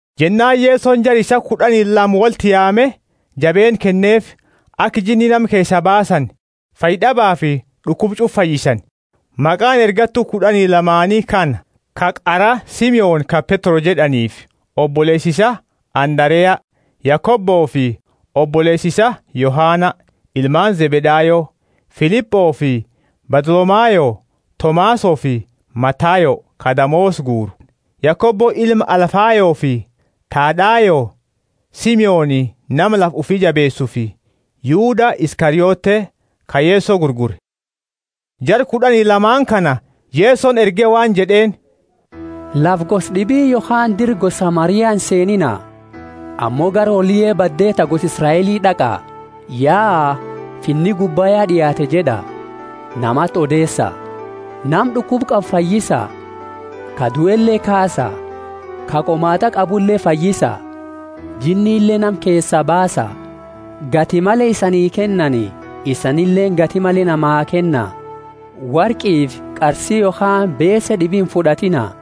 Jennaani Yesoni jara isaa kud'ani lama wolti yaame jabeenna kenneefi, aka jinni nama keesaa baasani, fayyad'abafi d'ukuba ch'ufa fayyisani. Maqaani ergattu kud'ani lamaani kana: ka qara, Simoni ka Petro jed'aniifi oboleesa isaa Andarea; Yakobofi oboleesa isaa Yohana, ilmaani Zebedayo; Filipofi Bartholomayo; Tomasofi Matayo, ka damoosa guuru; Yakobo ilma Alfayofi Thadayo; Simoni, nama lafa ufi jabeesufi Yuda Iskariote, ka Yeso gurgure. Jara kud'ani lamaani kana Yesoni erge waan jed'eeni, Lafa gosa d'ibi yokhaani dira gosa Samaria inseeniina. Ammo gara hooliye badde ta gosa Israeli d'aqa. Yaa, Finni gubba ya d'iaate jed'a, namati odeesa. Nama d'ukuba qabu fayyisa, ka duele kaasa, ka qomaat'a qabule fayyisa, jinnile nama keesa baasa. Gati male isanii kennani isanileeni gati male namaa kenna. Worqifi qarsi yokhaani beese d'ibi imfud'atiina;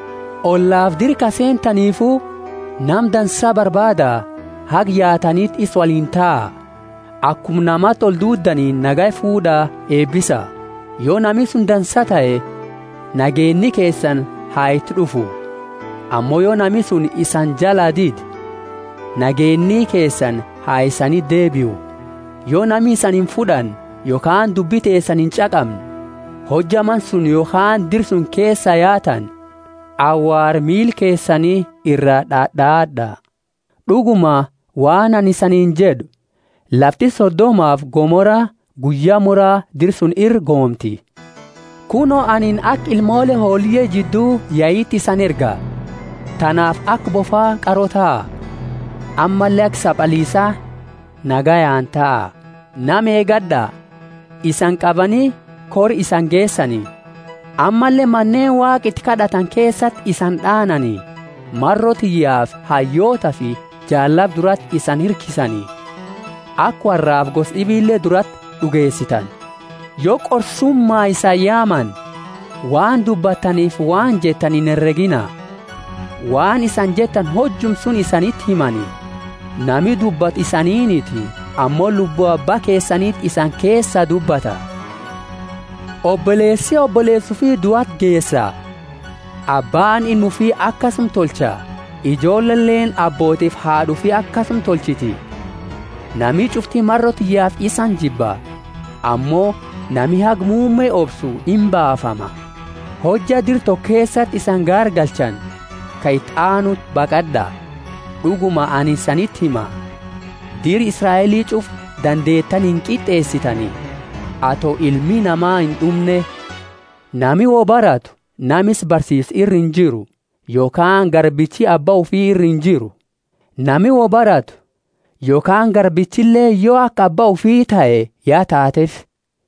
Ollafi dira ka seentanifu, nama dansa barbaada, haga yaataniti isa woliini taa. Akuma namati olduudanini nagaya fuud'a eebisa. Yo nami suni dansa tahe, nageenni keesani ha iti d'ufu; ammo yo nami suni isani jalaa dide, nageenni keesani ha isaniti deebiu. Yo nami isani imfud'anne, yokhaani dubbi teesani inch'aqamne, hojja mana suni yokhaani dira suni keesaa yaatani, awaara miila keesani ira d'ad'aad'a. D'uguma, waan anini isaniini jed'u, lafti Sodomafi Gomora guyya mura dira suni iraa goomti! Kuno, anini aka ilmoole hooliye jiddu yaiti isani erga. Tanaafi aka bofa qaro taha, ammalle aka sabaliisa nagayaani taa. Nama eegad'a; isani qabani kora isani geesani; ammalle Maneeni Waaqa iti kad'atani keesati isani d'aanani. Maro tiyyaafi hayyootafi jaallaba durati isani hirkisani, aka worraafi gosa d'ibile durati d'ugeesitani. Yo qorsuma isani yaamani, waan dubbattanifi waan jettani inheregiina; waan isani jettani hojuma suni isaniti himani. Nami dubbatu isaniiniti, ammo Lubbu Abba keesaniti isani keesa dubbata. Oboleesi oboleesa ufi duati geesa; abbaani ilma ufi akasuma tolcha; ijoolleleeni abbootifi haad'a ufi akasuma tolchiti. Nami ch'ufti maro tiyyaafi isani jibba. Ammo nami haga muumme obsu imbaafama. Hojja dira toko keesati isani gaargalchani, ka iti aanuti baqad'a. D'uguma, anini isaniti hima, dira Israeli ch'ufa dantetani inqit'eesitani, ato Ilmi Nama ind'umne. Nami woi baratu nama isa barsiisu ira injiru; yokhaani garbichi abba ufi ira injiru. Nami woi baratu, yo akuma nama isa barsiise tahe yokhaani garbichileeni yo aka abba ufi tahe ya taateefi.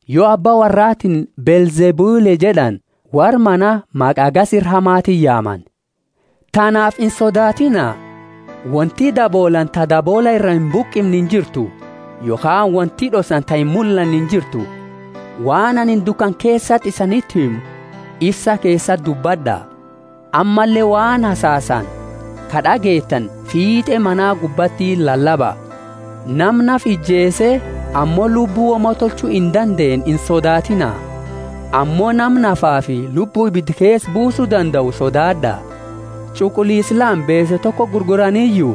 Yo abba worraatiini Beelzebuli jed'ani, worra mana maqa hagasi ira hamatiini yaamani! Tanaafi insodaatiina; wonti daboolaani ta daboola ira imbuqimne injirtu; yokhaani wonti d'ossani ta imullanne injirtu. Waan anini dukana keesati isaniti himu ifsa keesati dubbad'a; ammalle waan hasasani ka d'ageettani fiit'e mana gubbati lalaba. Nama nafa ijeese ammo lubbu woma tolchu indandeenne insodaatiina; ammo nama nafafi lubbu ibida keesa buusu dandau sodaad'a. Ch'uquliisa lama beese tokoti gurguraniyu?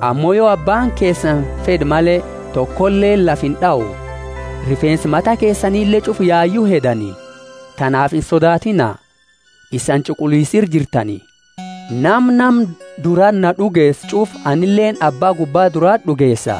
Ammo yo Abbaani keesani fed'e male, tokoleeni lafa ind'au. Rifeensa mata keesanile ch'ufa yayu hedani. Tanaafi insodaatiina; isani ch'uquliisa ira jirtani! Nama nama durati na d'ugeesu ch'ufa anileeni Abba gubba durati d'ugeesa.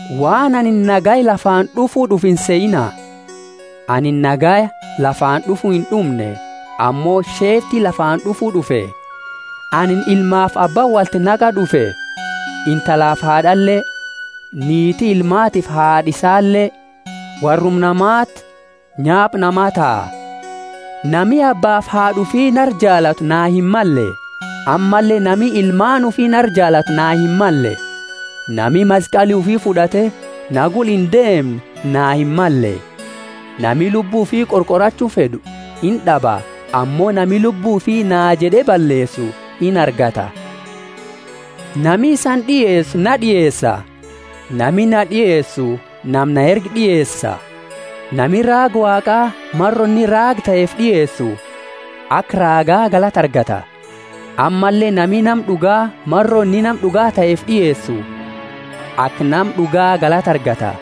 Waan anini nagaya lafaani d'ufu d'ufe insehiina; anini nagaya lafaani d'ufu ind'umne ammo sheefti lafaani d'ufu d'ufe. Anini ilmaafi abba wolti naqa d'ufe, intalafi haad'ale; niiti ilmaatiifi haad'a isaale; worruma namati nyaapa namaa taha. Nami abbaafi haad'a ufi nara jaalatu naa himmalle; ammalle nami ilmaani ufi nara jaalatu naa himmalle. Nami maskali ufi fud'ate na gula indeemne na himmalle. Nami lubbu ufi qorqorachu fed'u ind'aba; ammo nami lubbu ufi naa jed'e balleesu inargata. Nami isani d'ieesu, na d'ieesa; nami na d'ieesu nama na erge d'ieesa. Nami raaga Waaqa, maro inni raaga taheefi d'ieesu, aka raaga galata argata. Ammalle, nami nama d'uga, maro inni nama d'uga taheefi d'ieesu, aka nama d'uga galata argata.